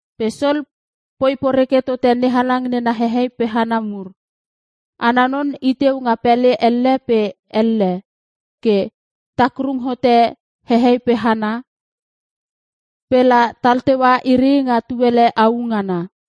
Pe Sol poi poreke tote NeHalang nena hehei pe hana mur. Ana non iteu nga pele elle pe elle ke takrung hote hehei pe hana, pe la tal teua iri nga tuele au ngana.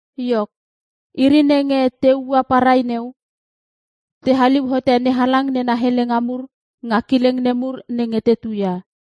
Iok, iri nenge te ua parai neu, te haliu hote NeHalang nena helenga mur nga kileng nemur nenge te tuia.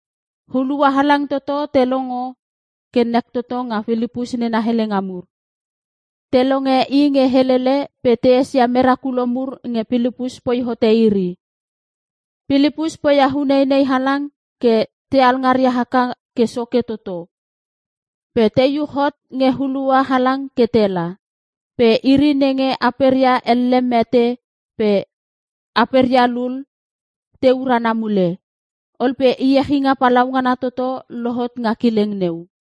Hulua halang toto te longo ke nek toto nga Pilipus nena helenga mur. Te longe i nge helele pe te esia merakulo mur nge Pilipus poi hotote iri. Pilipus poia uneinei halang ke te alngaria haka ke soke toto, pe te iuch hot nge hulua halang ke tela. Pe iri nenge aperia ele mete pe aperia lul te urana mule. Ol pe iechinga palaungana toto lohot nga kileng neu.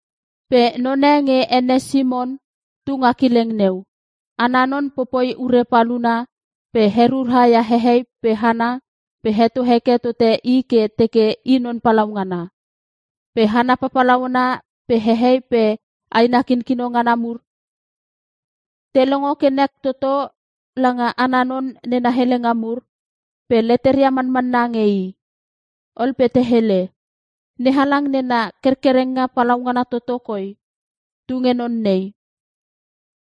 Pe none nge ene Simon tu nga kileng neu. Ana non popoi ure paluna pe herura ia hehei pe hana pe heto heke tote i ke teke i non palaungana. Pe hana papalauna pe hehei pe aina kinkino ngana mur te longo ke nek toto langa ana non nena helenga mur, pe leteria manmanna nge i. Ol pe te hele, “NeHalang nena kerkerenga palaungana toto koi tunge non nei.”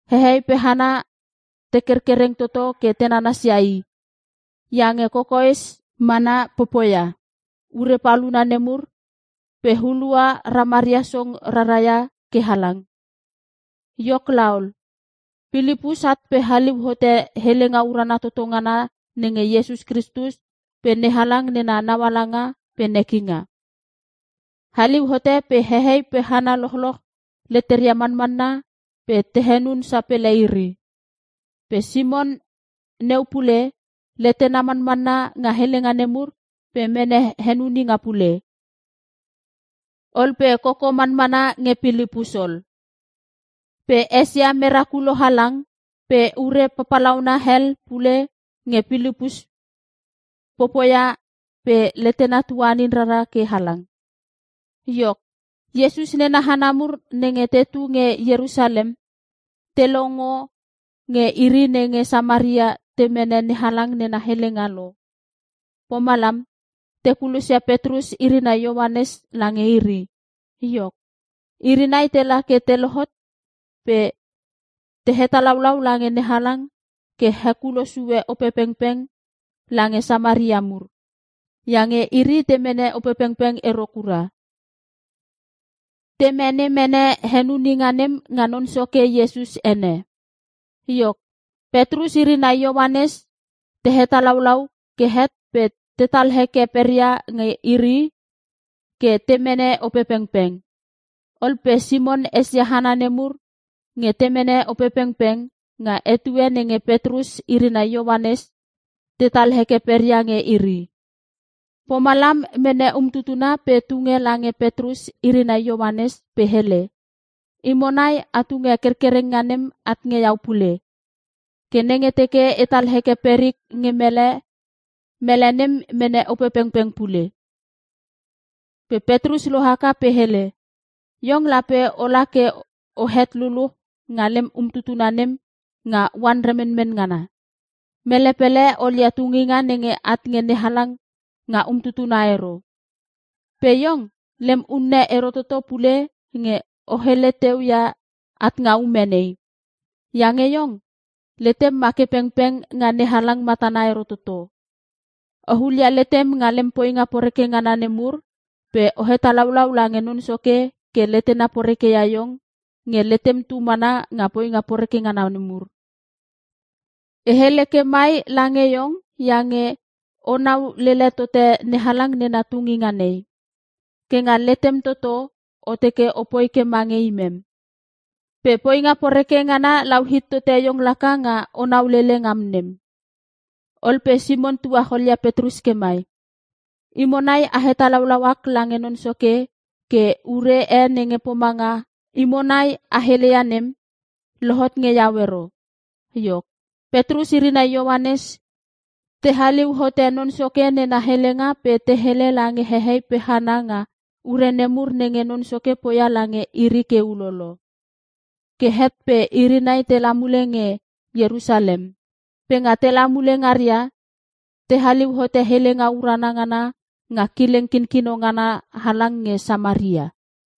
Hehei pe hana te kerkereng toto ke te nanasia i, iange kokoes mana popoia nena ure paluna nemur pe hulua ramaria song raraia ke halang. Iok laol, Pilipus at pe haliu hote helenga urana toto ngana nenge Iesus Kristus pe NeHalang nena naualanga pe nekinga. Haliu hote pe hehei pe hana lochloch leteria manmanna pe te henun sapele iri. Pe Simon neu pule, letena manmanna nga helenga nemur pe mene henuninga pule. Ol pe koko manmana nge Pilipus ol. Pe esia merakulo halang, pe ure papalauna hel pule nge Pilipus popoia pe letena tuanin rara ke halang. Iok, Iesus nena hana mur nenge tetu nge Ierusalem, te longo nge iri nenge Samaria te mene NeHalang nena helenga lo. Pomalam te kulosia Petrus iri nai Ioanes lange iri. Iok, iri nai tela ke te lohot pe, te hetalaulau lange NeHalang ke hekulo sue Opepengpeng lange Samaria mur. Iange iri te mene Opepengpeng ero kura. Te mene mene henuninga nem nga Non Soke Iesus ene. Iok, Petrus iri nai Ioanes te hetalaulau ke het pe tetal heke peria nge iri ke te mene Opepengpeng. Ol pe Simon esia hana nemur nge te mene Opepengpeng, nga etue nenge Petrus iri nai Ioanes tetal heke peria nge iri. Pomalam, mene umtutuna pe tunge lange Petrus iri nai Ioanes pe hele, “Imo nai a tunge kerkerenga nem at nge iau pule. Ke nenge teke etal heke perik nge mele, mele nem mene Opepengpeng pule.” Pe Petrus lohaka pe hele, “Iong lape ola ke ohet luluch nga lem umtutuna nem nga oan remenmen ngana. Mele pele olia tunginga nenge at nge NeHalang nga umtutuna ero! Pe iong, lem unne ero toto pule nge o hele teu ia at nga ume nei. Iange iong, letem ma ke pengpeng nga NeHalang matana ero toto. O hulia letem nga lem poinga poreke ngana nemur pe o hetalaulau lange Non Soke ke letena porekeia iong nge letem tu mana nga poinga poreke ngana nemur. E hele ke mai lange iong iange onau lele tote NeHalang nena tunginga nei. Ke nga letem toto, o teke opoi ke mange imem. Pe poinga poreke ngana lau hit tote iong laka nga onau lele ngam nem.” Ol pe Simon tuacholia Petrus ke mai, “Imo nai a hetalau ak lange Non Soke ke ure e nge pomanga imo nai a heleia nem, lohot nge iau ero.” Iok, Petrus iri nai Ioanes te haliu hote Non Soke nena helenga pe te hele lange hehei pe hana nga ure nemur nenge Non Soke poia lange iri ke ulolo. Ke het pe iri nai tela mule nge Ierusalem. Pe nga tela mule ngaria, te haliu hote helenga urana ngana nga kileng kinkino ngana halang nge Samaria.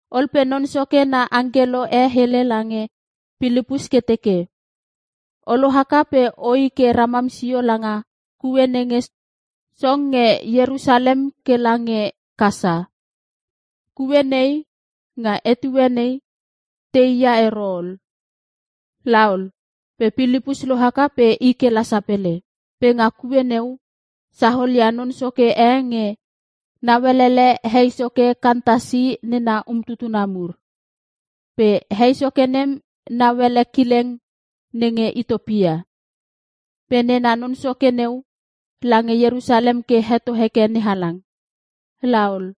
Ol pe Non Soke na angkelo e hele lange Pilipus ke teke, “O lohaka pe oi ke ramam sio langa kue nenge song nge Ierusalem kela nge Kasa.” Kue nei, nga etue nei, tei ia ero ol. Laol pe Pilipus lohaka pe i kela sapele. Pe nga kue neu, saolia non soke e nge nauelele hei soke Kantasi nena umtutuna mur. Pe hei soke nem nauele kileng nenge Itiopia. Pe nena non soke neu, lange Ierusalem ke heto hekeke NeHalang. La ol,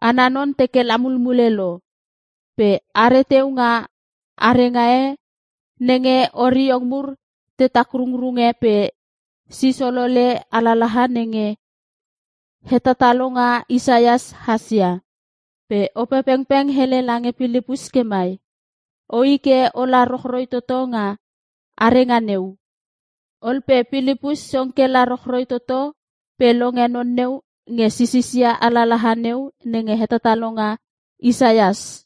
ana non teke la mulmule lo. Pe are teu nga arenga e nenge oriong mur te takrungrunge pe sis olole alalaha nenge hetatalonga Isaias hasia. Pe Opepengpeng hele lange Pilipus ke mai, “Oi ke ola rochroi toto nga arenga neu.” Ol pe Pilipus song kela rochroi toto pe longe non neu nge sisisia alalaha neu nenge hetatalonga Isaias.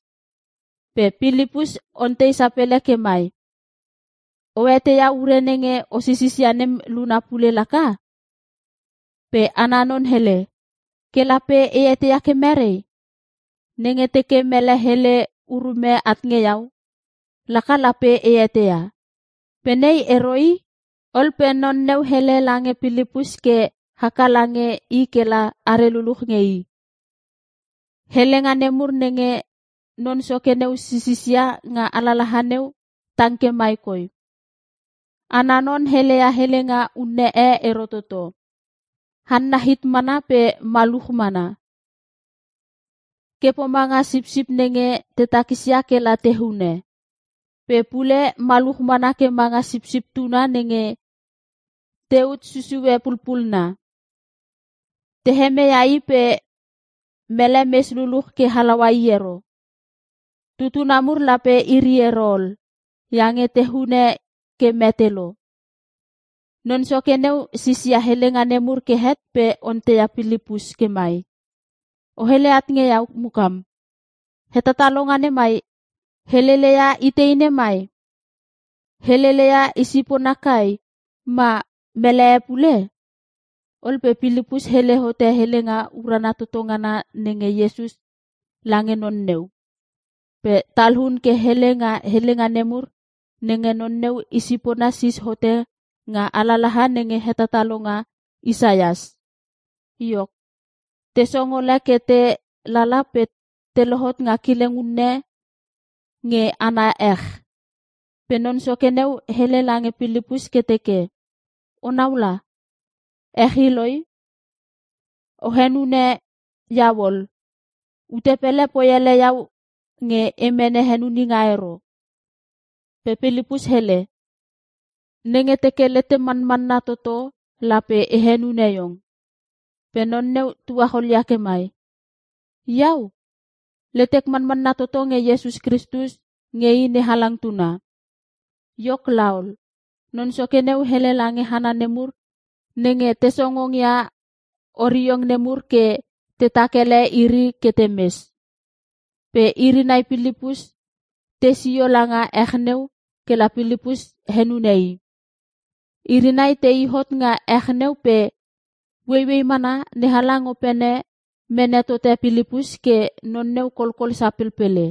Pe Pilipus ontei sapele ke mai, “O eteia ure nenge o sisisia nem luna pule laka?” Pe ana non hele, “Ke lape e eteia ke mere? Nenge teke mele hele urume at nge iau laka lape e eteia. Pe nei ero i.” Ol pe non neu hele lange Pilipus ke haka lange i kela are luluch nge i. Helenga nemur nenge non soke neu sisisia nga alalaha neu tang ke mai koi, “Ana non heleia helenga unne e ero toto. Hanna hit mana pe maluch mana ke pomanga sipsip nenge te takisia kela te hunune. Pe pule maluch mana ke manga sipsip tuna nenge te ut susue pulpunna. Te hemeia i pe mele mes luluch ke halaua i ero. Tutuna mur lape iri ero ol iange te hune ke mete lo.” Non soke neu sisia helenga nemur ke het pe onteia Pilipus ke mai, “O hele at nge iau mukam, hetatalonga nemai heleleia itei nemai? Heleleia i sipona kai, ma mele e pule?” Ol pe Pilipus hele hote helenga urana toto ngana nenge Iesus lange non neu. Pe talun ke hele nga helenga nemur nenge non neu i sipona sis hote nga alalaha nenge hetatalonga Isaias. Iok, te song ole ke te lala pela te lohot nga kileng unne nge ana ech. Pe non soke neu hele lange Pilipus ke teke, “O naula, ech i loi. O henune iau ol. Ute pele poi ele iau nge e mene henuninga ero.” [ Pe Pilipus hele, “Nenge teke letem manmanna toto, lape e henune iong.” Pe non neu tuacholia ke mai, “Iau, letek manmanna toto nge Iesus Kristus nge i NeHalang tuna.”] Iok laol, non soke neu hele lange hana nemur nenge te songongia oriong nemur ke tetak ele iri ke temes. Pe iri nai Pilipus te i sio langa ech neu kela Pilipus henune i. Iri nai tei hot nga ech neu pe ueiuei mana NeHalang opene mene tote Pilipus ke non neu kolkol sapelpele.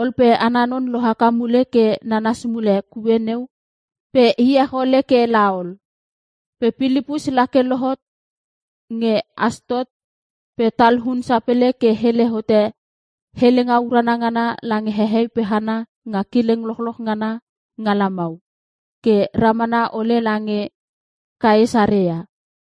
Ol pe ana non lohaka mule ke nanas mule kue neu pe iech ole ke laol. Pe Pilipus la ke lohot nge Astot pe talun sapele ke hele hote helenga urana ngana lange hehei pe hana nga kileng lochloch ngana nga lamau, ke ramana ole lange Kaesarea.